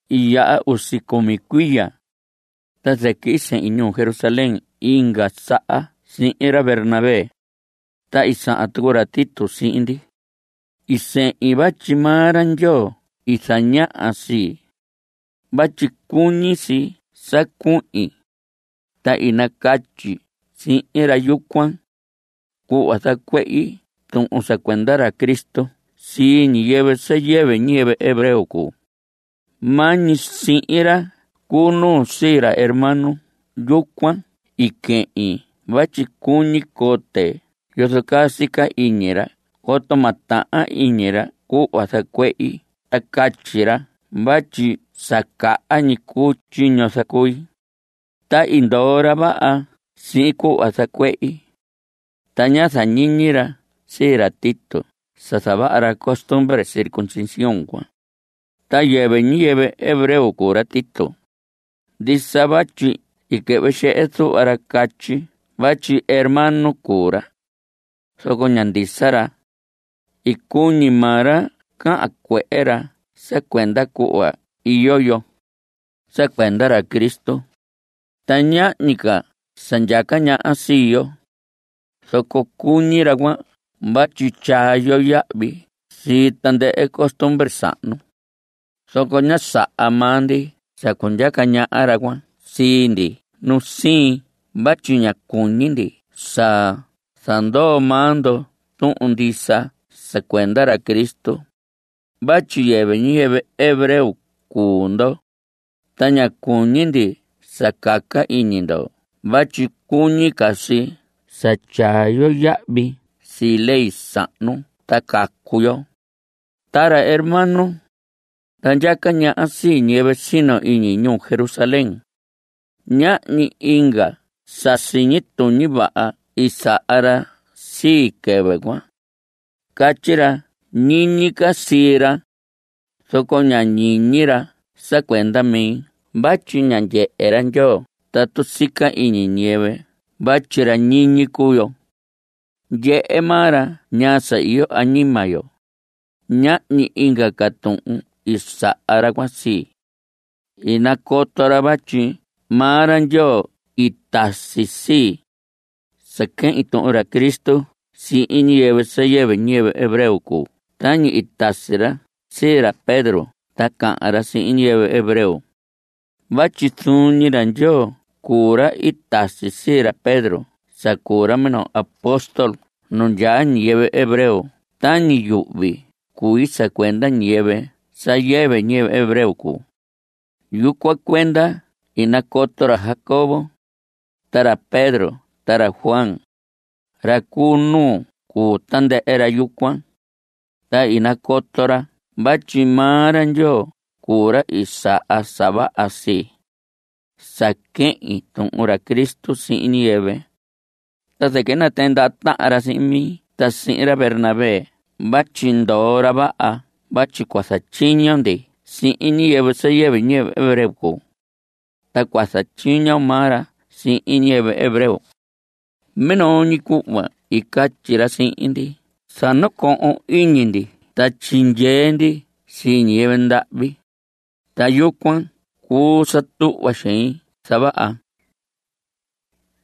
I yaha usi cumi cuiya, ta zɨquɨ i sehin ñuu Jerusalén inga saha sihin ra Bernabé. Ta i sahan tucu ra Tito sihin ndi. I sehin vatyi maa ra Ndyoo i zañaha sii, vatyi cuñi si sa cuhin. Ta i nacatyi sihin ra yucuan, cuhva zacuehi tuhun sa cuenda ra Cristo sii ñiyɨvɨ sa yɨvɨ ñiyɨvɨ hebreo cuu. Maa ñi sihin ra cu nuu sii ra hermano yucuan i quehin vatyi cuñi cote yozo caa sica iñi ra coto ma tahan iñi ra cuhva zacuehi ta catyi ra vatyi sa caha ñi cuu tyiño zacui. Ta i ndoo ra vaha sihin cuhva zacuehi. Ta ñá zañiñi ra sii ra Tito sa zavaha ra costumbre circuncisión cuan, ta yɨvɨ ñiyɨvɨ hebreo cuu ra Tito. Ndisa vatyi i quɨhvɨ xehe zuhva ra catyi vatyi hermano cuu ra, zoco ña ndisa ra. I cuñi maa ra cahan cuehe ra sa cuenda cuhva iyo yo. Sa cuenda ra Cristo, ta ñahñi ca sa ndyaca ñaha sii yo, zoco cuñi ra cuan vatyi tyaa yo yahvi sii tandɨhɨ costumbre sahnu. Zoco ñá saha maa ndi sa cundyaca ñaha ra cuan sii ndi nu siin vatyi ña cuñi ndi sa zandoo maa ndo tuhun ndisa sa cuenda ra Cristo. (Vatyi yɨvɨ ñiyɨvɨ hebreo cuu ndo, ta ña cuñi ndi sa caca iñi ndo vatyi cuñi ca si sa tyaa yo yahvi sii ley sahnu ta cacu yo.) Ta ra hermano, ra ndyaca ñaha sii ñiyɨvɨ sino iñi ñuu Jerusalén, ñahñi inga sa siñi tuñi vaha i saha ra sii, quɨvɨ cuan. Catyi ra ñiñi ca sii ra, zoco ña ñiñi ra sa cuenda mi vatyi ña ndyehe ra Ndyoo tatu sica iñi ñiyɨvɨ vatyi ra ñiñi cuu yo. Ndyehe maa ra ñaa sa iyo añima yo. Ñahñi inga ca tuhun i saha ra cuan sii. I nacoto ra vatyi maa ra Ndyoo i tasi sii, sa quehin tuhun ra Cristo sihin ñiyɨvɨ sa yɨvɨ ñiyɨvɨ hebreo cuu tañi i tasi ra sii ra Pedro sa cahan ra sihin ñiyɨvɨ hebreo. Vatyi zuun ñi ra Ndyoo cuu ra i tasi sii ra Pedro sa cuu ra minoo apóstol nu ndyaa ñiyɨvɨ hebreo tañi yuhvi cui sa cuenda ñiyɨvɨ sa yɨvɨ ñiyɨvɨ hebreo cuu. Yucuan cuenda i nacoto ra Jacobo, ta ra Pedro, ta ra Juan, ra cu nuu cuu tandɨhɨ ra yucuan, ta i nacoto ra vatyi maa ra Ndyoo cuu ra i saha sa vaha sii, sa quehin tuhun ra Cristo sihin ñiyɨvɨ. Ta zɨquɨ i natɨɨn ndaha tahan ra sihin mi ta sihin ra Bernabé vatyi ndoo ra vaha vatyi cua zatyiño ndi sihin ñiyɨvɨ sa yɨvɨ ñiyɨvɨ hebreo cuu, ta cua zatyiño maa ra sihin ñiyɨvɨ hebreo. Minoo ñi cuhva i catyi ra sihin ndi sa nacohon iñi ndi ta tyindyee ndi sii ñiyɨvɨ ndahvi, ta yucuan cuu sa tuhva xein zavaha.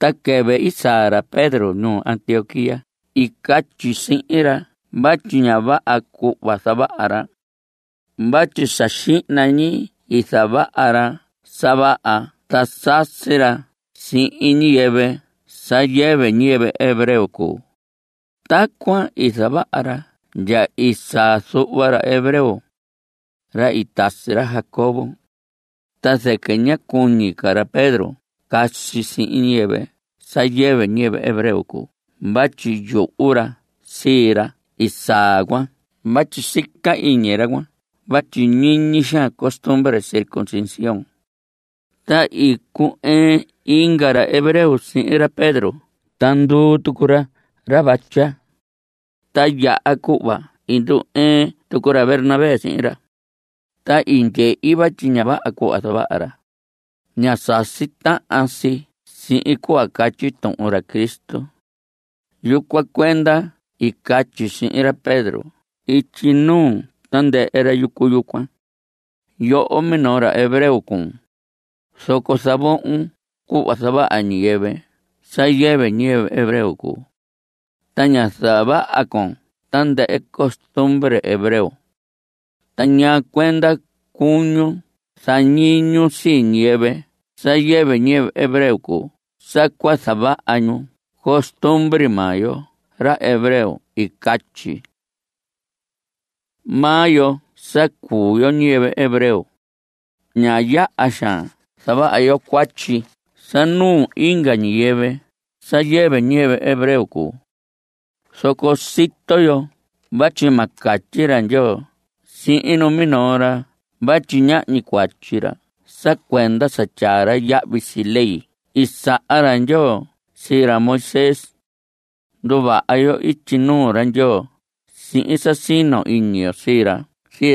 Ta quɨvɨ i saa ra Pedro ñuu Antioquía i catyi sihin ra vatyi ña vaha cuhva zavaha ra. Vatyi sa xihna ñi i zavaha ra sa vaha ta sasi ra sihin ñiyɨvɨ sa yɨvɨ ñiyɨvɨ hebreo cuu. Tacuan i zavaha ra ndya i saa zuhva ra hebreo, ra i tasi ra Jacobo, ta zɨquɨ ñá cuñi ca ra Pedro casi sihin ñiyɨvɨ sa yɨvɨ ñiyɨvɨ hebreo cuu vatyi yuhu ra sii ra i saa cuan vatyi sica iñi ra cuan vatyi ñiñi xaan costumbre circuncisión. Ta i cu‑ɨɨn inga ra hebreo sihin ra Pedro ta nduu tucu ra ra vatya, ta ndya cuhva i ndu‑ɨɨn tucu ra Bernabé sihin ra. Ta i ndyehi vatyi ña vaha cuhva zavaha ra. Ña sasi tahan si sihin cuhva catyi tuhun ra Cristo. Yucuan cuenda i catyi sihin ra Pedro ityi nuu tandɨhɨ ra yucu yucuan: “Yoho, minoo ra hebreo cuun, zoco zavohon cuhva zavaha ñiyɨvɨ sa yɨvɨ ñiyɨvɨ hebreo cuu. Ta ña zavaha con tandɨhɨ costumbre hebreo. ¿Ta ñaa cuenda cuñun zañiñun sii ñiyɨvɨ sa yɨvɨ ñiyɨvɨ hebreo cuu sa cua zavaha ñu costumbre maa yo ra hebreo?” I catyi. Maa yo sa cuu yo ñiyɨvɨ hebreo, ña yaha xaan zavaha yo cuatyi sa nuu inga ñiyɨvɨ sa yɨvɨ ñiyɨvɨ hebreo cuu. Zoco sito yo vatyi ma catyi ra Ndyoo sihin numinoo ra vatyi ñahñi cuatyi ra sa cuenda sa tyaa ra yahvi sii ley i saha ra Ndyoo sii ra Moisés. Nduvaha yo ityi nuu ra Ndyoo sihin sa sino iñi yo sii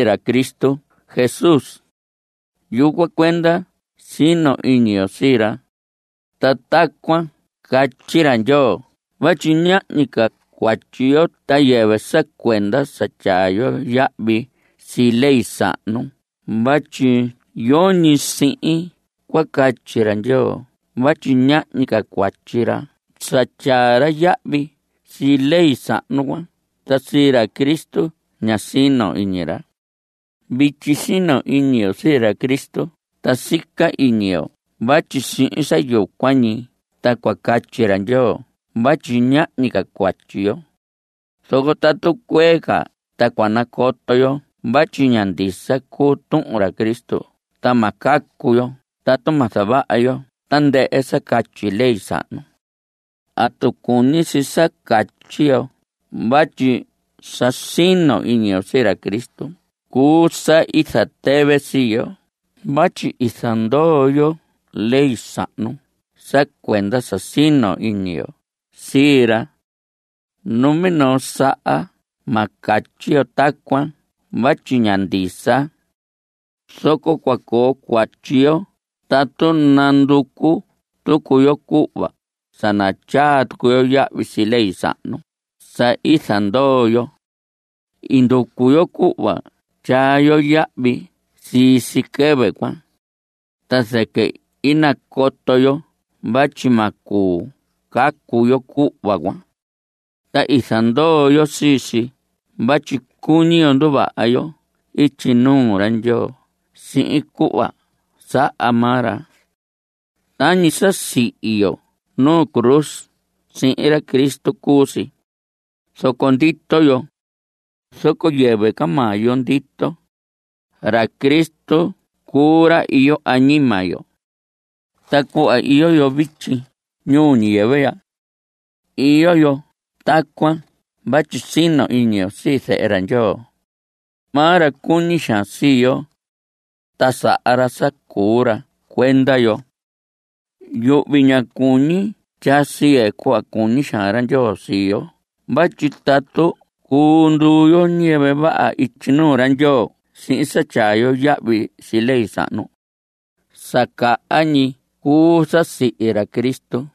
ra Cristo Jesús. Yucuan cuenda sino iñi yo sii ra. Ta tacuan ta catyi ra Ndyoo vatyi ñahñi ca cuatyi yo ta yɨvɨ sa cuenda sa tyaa yo yahvi sii ley sahnu vatyi yoñi sihin cua catyi ra Ndyoo vatyi ñahñi ca cuatyi ra sa tyaa ra yahvi sii ley sahnu cuan, ta sii ra Cristo ña sino iñi ra. Vityi sino iñi yo sii ra Cristo ta sica iñi yo vatyi sihin sa yucuan ñi ta cua catyi ra Ndyoo vatyi ñahñi ca cuatyi yo. Zoco tatu cuee ca ta cua nacoto yo vatyi ña ndisa cuu tuhun ra Cristo ta ma cacu yo tatu ma zavaha yo tandɨhɨ sa catyi ley sahnu. ¿Atu cuñi si sa catyi yo vatyi sa sino iñi yo sii ra Cristo cuu sa i zatɨvɨ sii yo vatyi i zandoo yo ley sahnu sa cuenda sa sino iñi yo sii ra? ¡Numinoo saha ma catyi yo tacuan vatyi ña ndisa! Zoco cua coo cuatyi yo tatu nanducu tucu yo cuhva sa natyaa tucu yo yahvi sii ley sahnu sa i zanandoo yo. I nducu yo cuhva tyaa yo yahvi sii si quɨvɨ cuan. Ta zɨquɨ i nacoto yo vatyi ma cuu cacu yo cuhva cuan, ta i zandoo yo sii si vatyi cuñi yo nduvaha yo ityi nuu ra Ndyoo sihin cuhva saha maa ra. Tañi sa sihi yo nu cruz sihin ra Cristo cuu si, zoco ndito yo. Zoco yɨvɨ ca maa yo ndito, ra Cristo cuu ra iyo añima yo. Ta cuhva iyo yo vityi ñuu ñiyɨvɨ ya, iyo yo tacuan vatyi sino iñi yo sii Zehe ra Ndyoo. Maa ra cuñi xaan sii yo, ta saha ra sa cuu ra sa cuenda yo. Yuhvi ña cuñi tyaa siye cuhva cuñi xaan ra Ndyoo sii yo vatyi tatu cuu nduu yo ñiyɨvɨ vaha ityi nuu ra Ndyoo sihin sa tyaa yo yahvi sii ley sahnu, sa caha ñi cuu sa i sihi ra Cristo.